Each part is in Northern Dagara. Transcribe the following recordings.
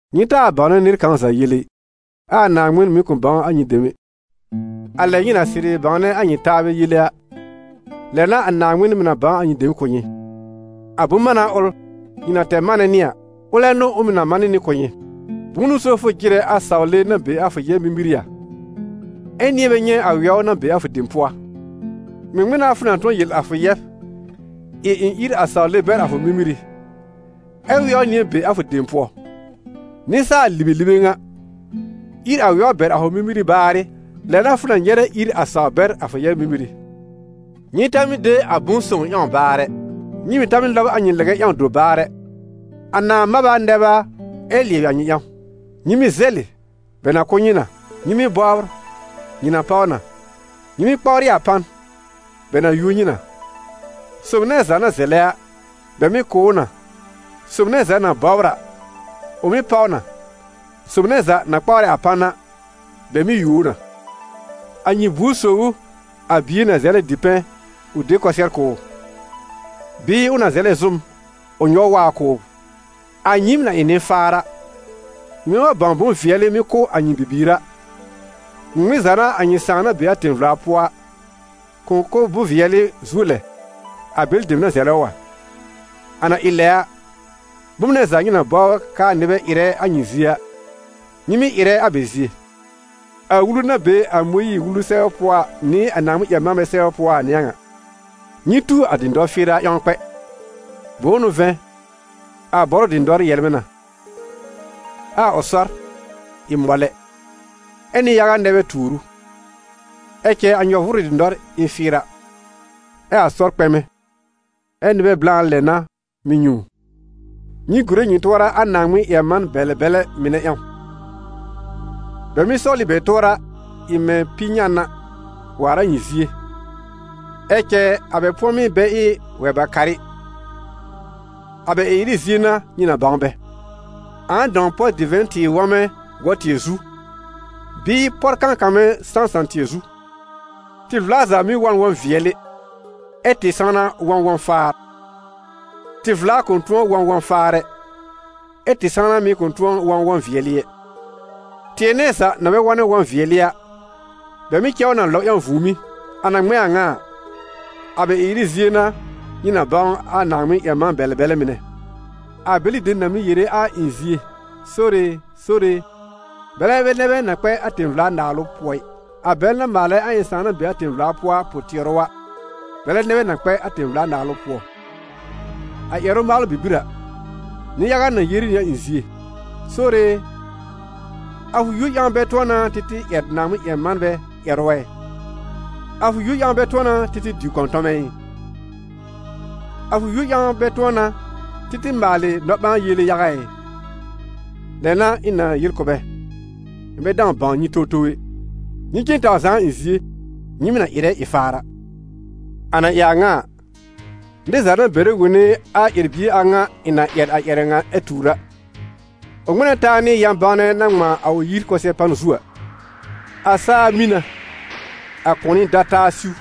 «Nyɩ taa bãwnɛ nɩr kãw za yele ɩ, ɛ a Naaŋmɩn mɩ̀ kʋ̃ bãw a nyɩ dem ɛ. A lɛ nyɩ na sɩrɩ bãwnɛ a nyɩ taabɛ yele a, lɛ n'a a Naaŋmɩn mɩ̀ na bãw a nyɩ dem kʋ̀ nyɩ; a bʋ̃-mána ʋl nyɩ na tɛr manɛ nɩ a, ʋlɛ n'ʋ ʋ mɩ̀ na man nɩ kʋ̀ nyɩ. Bʋ̃ʋ n'ʋ so fʋ jɩrɛ a sawle na be a fʋ yɛb mímírí a, ɛ nɩ̃ɛ bɛ nyɛ̃ a wɛw na be a fʋ dem pʋɔ a? Ŋmɩŋmɩn n'a fʋ na tʋ̃ɔ yel a fʋ yɛb: ‹Ɩ ɩ̃ ír sawle bɛr a fʋ mímírí›, ɛ wɛw nɩ̃ɛ be a fʋ dem pʋɔ? Nɩsaal-libelibe ŋa, ír a wɛw bɛr a fʋ mímírí baarɩ, lɛ n'a fʋ na nyɛrɛ ír a sawr bɛr a fʋ yɛb mímírí.» «Nyɩ ta mɩ́ de a bʋ̃-sõw ƴãw baar ɛ, nyɩ mɩ̀ ta mɩ́ lɔb a nyɩ lɛgɛ ƴãw dobaar ɛ, a nãá mab a nɛb a, ɛ lɩɛbɩ a nyɩ ƴãw.» «Nyɩ mɩ́ zɛlɩ, bɛ na kʋ̀ nyɩ na; nyɩ mɩ́ bɔbr, nyɩ na páw na; nyɩ mɩ́ kpawrɩ a pan, bɛ na yuo nyɩ na. Sob nɛ za na zɛlɛ a, bɛ mɩ́ kʋ̀ ʋ na, sob nɛ za na mɩ́ bɔbr a, ʋ mɩ́ páw na; sob nɛ za na kpawrɛ a pan a, bɛ mɩ́ yuo ʋ na. A nyɩ buor sob ʋ, a bie na zɛlɛ dipɛ̃ ʋ de kʋsɩɛr kʋ̀ ʋ? Bɩɩ ʋ na zɛlɛ zʋ́m, ʋ nyɔw waab kʋ̀ ʋ? A nyɩɩm na ɩ nɩ-faar a, nyɩmɛ wa bãw bʋ̃-vɩɛlɩ mɩ́ kʋ̀ a nyɩ bibiir a, ŋmɩŋmɩn za n'a a nyɩ Sãà na be a tẽ-vla pʋɔ a, kʋ̃ kʋ̀ bʋ̃-vɩɛlɩ zuo lɛ, a bɛlɩ dem na zɛlɛ ʋ a? A na ɩ lɛ a, bom nɛ za nyɩ na bɔbr k'aa nɩbɛ ɩrɛ a nyɩ zie a, nyɩ mɩ́ ɩrɛ a bɛ zie: a Wulu na be a Mõyiir-Wulu sɛbɛ pʋɔ nɩ a Naaŋmɩn-ƴɛr-manbɛ sɛbr pʋɔ a n'ɩ a ŋa.» «Nyɩ tu a dɩ̃dɔr fɩɩra ƴãw kpɛ. Bʋ̃ʋ n'ʋ vɛ̃, a bɔrʋ dɩ̃dɔr yɛlmɛ̃ na, ɛ a ʋ sɔr ɩ mɔlɛ, ɛ nɩ-yaga nɛ bɛ tuur ʋ. Ɛ cɛ a nyɔ-vʋʋrʋ dɩ̃dɔr ɩ n fɩɩra, ɛ a ʋ sɔr kpɛmɛ, ɛ nɩbɛ blã lɛ n'a mɩ́ nyɛ̃ ʋ.» «Nyɩ gùre nyɩ tʋɔra a Naaŋmɩn-ƴɛr-man-bɛlɛ-bɛlɛ mɩnɛ ƴãw. Bɛ mɩ́ sɔwl ɩ bɛ tʋɔra ɩ mɛ̃ pi-nyan a, waar a nyɩ zie, ɛ cɛ a bɛ pʋ̃ɔmɩ́ bɛ ɩ wɛ-ba-karɩ. A bɛ ɩ-ɩrɩ zie n'a nyɩ na bãw bɛ. Ãa dãw pɔr divɛ̃ tɩɩr wɔ̃mɛ gɔ-tɩɛ zu, bɩɩ pɔr kãkamɛ sãsã-tɩɛ zu? Tɩ-vla za mɩ́ wɔ̃ n wɔ̃-vɩɛlɩ, ɛ tɩ-sãwna wɔ̃ wɔ̃-faar. Tɩ-vla kʋ̃ tʋ̃ɔ wɔ̃ wɔ̃-faar ɛ, ɛ́ tɩ-sãwna mɩ̀ kʋ̃ tʋ̃ɔ wɔ̃ wɔ̃-wɩɛlɩ ɛ. Tɩɛ nɛ za na bɛ wɔ̃nɛ wɔ̃-vɩɛlɩ a, bɛ mɩ́ cɛ ʋ na lɔb ƴãw vũùmí. A na ŋmɛ̃ a ŋa a, a bɛ ɩ-ɩrɩ zie n'a nyɩ na bãw a Naaŋmɩn-ƴɛr-man-bɛlɛ-bɛlɛ mɩnɛ.» «A bɛlɩ dem na mɩ́ yere a ɩ̃ zie: ‹Sore e, Sore e›, bɛlɛ bɛ nɛ bɛ na kpɛ a tẽ-vla-naalʋ pʋɔ ɩ, a bɛl na maalɛ a ɩ̃ Sãà na be a tẽ-vla pʋɔ a pʋ-tɩɛrʋ a, bɛlɛ nɛ bɛ na kpɛ a tẽ-vla-Naalʋ pʋɔ. A ƴɛrʋ-maalʋ bibir a, nɩ-yaga na yere nɩ a ɩ̃ zie: ‹Sore e, a fʋ yúor ƴãw bɛ tʋ̃ɔ n'a tɩ tɩ ƴɛr Naaŋmɩn-ƴɛr-manbɛ ƴɛrʋ ɛ? A fʋ yúor ƴãw bɛ tʋ̃ɔ n'a tɩ tɩ diw kɔ̃tɔmɛ ɩ? A fʋ yúor ƴãw bɛ tʋ̃ɔ n'a tɩ tɩ maalɩ nɔ-ɓãa-yele yaga ɩ?› Lɛ n'a ɩ̃ na yel kʋ̀ bɛ: ‹Ɩ̃ bɛ dãw bãw nyɩ towtow ɛ, nyɩ cen taw zaa a ɩ̃ zie, nyɩɩm na ɩrɛ ɩ-faar a!›» « A na ɩ a ŋa a, nɩr za na bɛrɛ wone a ƴɛr-bie a ŋa ɩ̃ na ƴɛr a ƴɛrɛ ŋa ɛ tuur a a, ʋ ŋmɛ̃ na taa nɩ yã-bãwnɛ na ŋmãa a ʋ yir kʋsɛ-pan zu a. A saa mĩ na, a kʋ̃ɔnɩ da taa siw,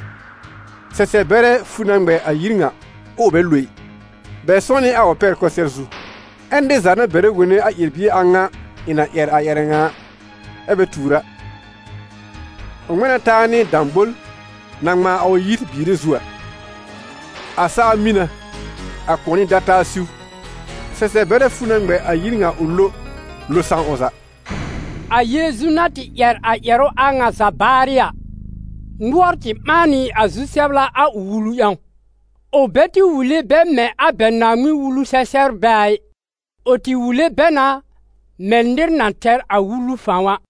sɛsɛb-bɛrɛ fu na ŋmɛ a yir ŋa, ʋʋ bɛ lo ɩ: bɛ sʋ̃ɔ́ nɩ a ʋ pɛr kʋsɩɛr zu. Ɛ nɩr za na bɛrɛ wone a ƴɛr-bie a ŋa ɩ̃ na ƴɛr a ƴɛrɛ ŋa ɛ bɛ tuur a, ʋ ŋmɛ̃ na taa nɩ dãbol na ŋmãa a ʋ yir biire zu a. A saa mĩ na, a kʋ̃ɔnɩ da taa siw, sɛsɛb-bɛrɛ fu na ŋmɛ a yir ŋa ʋ lo, lo sãw ʋ za.» A Yeezu na tɩ ƴɛr a ƴɛrʋ a ŋa za baarɩ a, nʋɔr tɩ ɓãa nɩ a zu-sɛbla a ʋ wulu ƴãw; ʋ bɛ tɩ wule bɛ mɛ̃ a bɛ Naaŋmɩn-Wulu-sɛ-sɛbrbɛ a ɩ, ʋ tɩ wule bɛ na mɛ̃ nɩr na tɛr a wulu fãw a.